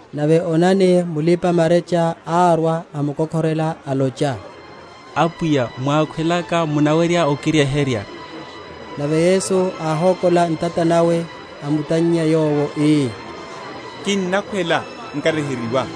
Nave onani, mulipa‐marecha árwa, amkokhorela, alocha, Apwiya mwákhwelaka munawerya okiryeherya. Nave Yesu áhokola ntata nawe, amutannya yowo, ii, Kinnakhwela, nkaryeheryiwa.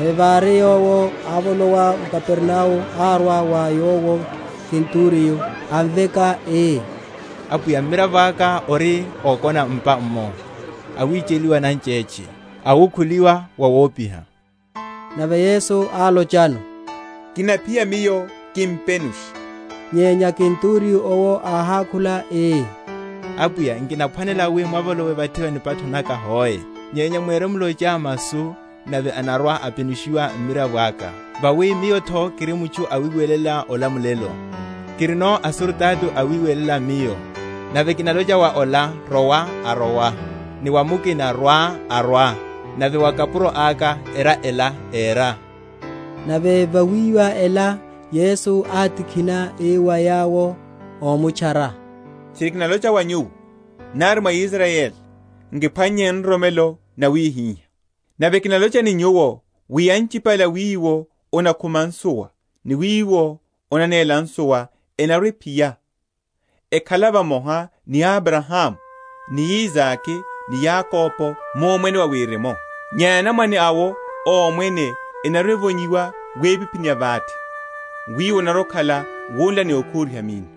Nave vári Yowo ávolowa m’Kapernao árwa wa Yowo kenturiyo, amveka, ii, Apwiya, mmiravo aka ori ókona m’pa’mmo, awicheliwa nanchétche, awukhuliwa wawopiha. Nave Yesu álochano, Kinaphiya Miyo, kimpenushe; Nyenya kenturiyo’wo áhákhula ii, Apwiya, nkinaphwanela wi mwavolowe vathi va nipatho naka hoe: nyenya mwirimlocha masu, nave anarwa‐apenushiwa mmiravo aka. Vawi miyo’tho kiri mutchu awiwelela olamulelo, kirino asurutato awiwelela miyo: nave kinalocha wa ola, Rowa, arowa; ni wa mukina, Rwa, arwa; nave wa kapuro aka, Era ela, éra. Nave vawíwa ela, Yesu átikhina, ii wa yawo ómutchara, Tchiri kinalocha wa nyuwo, nari mwa Israyeli, nkiphwannye nroromelo nawihiha. Nave kinalocha ni nyuwo, wi anchipale a wiwo onakhuma nsuwa ni a wiwo onanela nsuwa enarwa‐ephiya, ekhala vamoha ni Abrahamu, ni Isake, ni Yakobo, mu Omwene wa Wirimu; nyenya anamwane awo a Omwene enarwa‐evonyiwa wipiphini ya vate: wiwo onarwa‐okhala wunla ni okhuriha minno.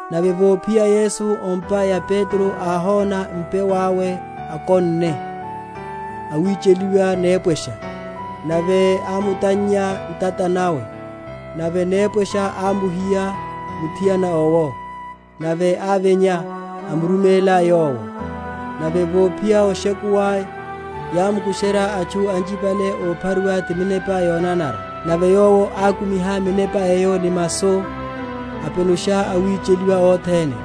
Nave vophiya Yesu o’mpa ya Petro, áhona mpewe awe akonne, awicheliwa nepwesha. Nave ámutannya ntata nawe, nave nepwesha ámuhiva muthiana owo; nave ávinya, amuruméla Yowo. Nave vophiya oshekuwa, yámukusherya atchu anchipale ophariwa ti minepa yonanara: nave Yowo ákumiha minepa eyo ni masu, apenusha awicheliwa othene: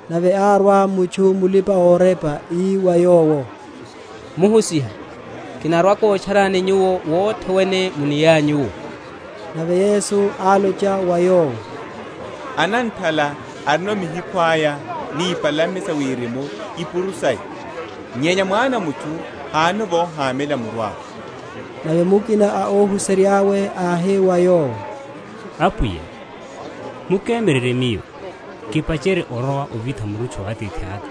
Nave árwa mutchu mulipa‐orepa, ii wa Yowo, Muhusiha, kinarwa‐kotcharani Nyuwo wothe wene muniyanyu’wo. Nave Yesu álocha wa yowo, Ananthala arino mihikhwe aya, ni ipalame sa wirimu ipuru saya, nyenya Mwana a mutchu hánono vohamela muru awe. Nave mukina a óhuserya’we, áhi wa Yowo, Apwiya, mukemyererye miyo kipacherye orowa ovitha murutchu wa atithaka.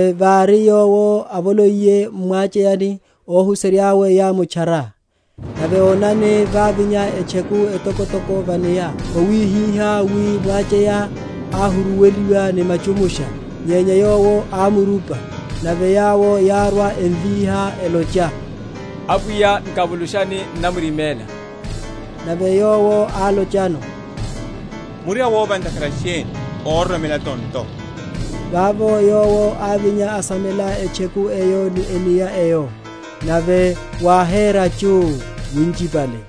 Nave vári Yowo avoloiye m’mwacheyani, óhuserya’we yámutchara. Nave onani, vávinya etcheku etokotoko va’nia, wawihihá wi mwacheya áhuruweliwa ni machumusha: nyenya Yowo ámurupa. Nave yawo yárwa, emvíha, elocha, Apwiya nkavulushani, n’namrimela. Nave Yowo álochano, Muri awova ntakhara sheni, óroromela tonto? Vavo Yowo ávinya, asamela etcheku eyo ni enia eyo, nave wáhera chuu winchipale.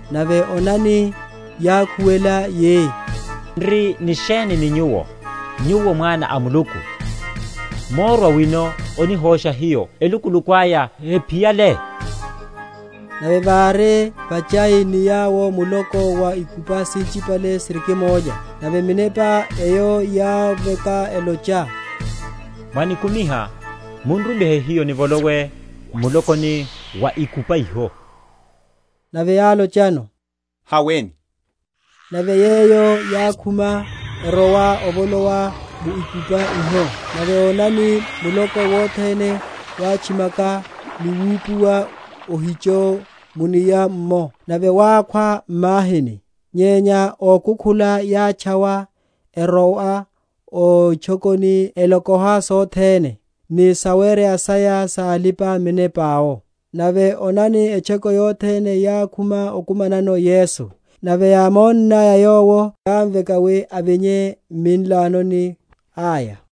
Nave onani, yákhuwela yi, N’ri ni sheni ni Nyuwo, Nyuwo Mwana a Muluku? Mórwa wino onihosha hiyo, elukuluku aya hephiyale? Nave vári vachai ni yawo muloko wa ikupa sinchipale sirikimólya. Nave minepa eyo yámveka elocha, Mwanikumiha, mun’rumihe hiyo nivolowe m’mulokoni wa ikupa iho. Nave álochano, Haweni. Nave yeyo yákhuma, erowa ovolowa mu ikupani iho: nave onani, muloko wothene wátchimaka ni wupuwa ohicho mu’nia’mmo, nave wákhwa m’mahini. Nyenya ókukhula yátchawa, erowa o itchokoni, elokoha sothene, ni sawereya saya sa alipa‐minepa’wo. Nave onani, etchoko yothene yákhuma okumanano Yesu, nave yámonnaya Yowo, yámveka wi avinye m’minlanoni aya.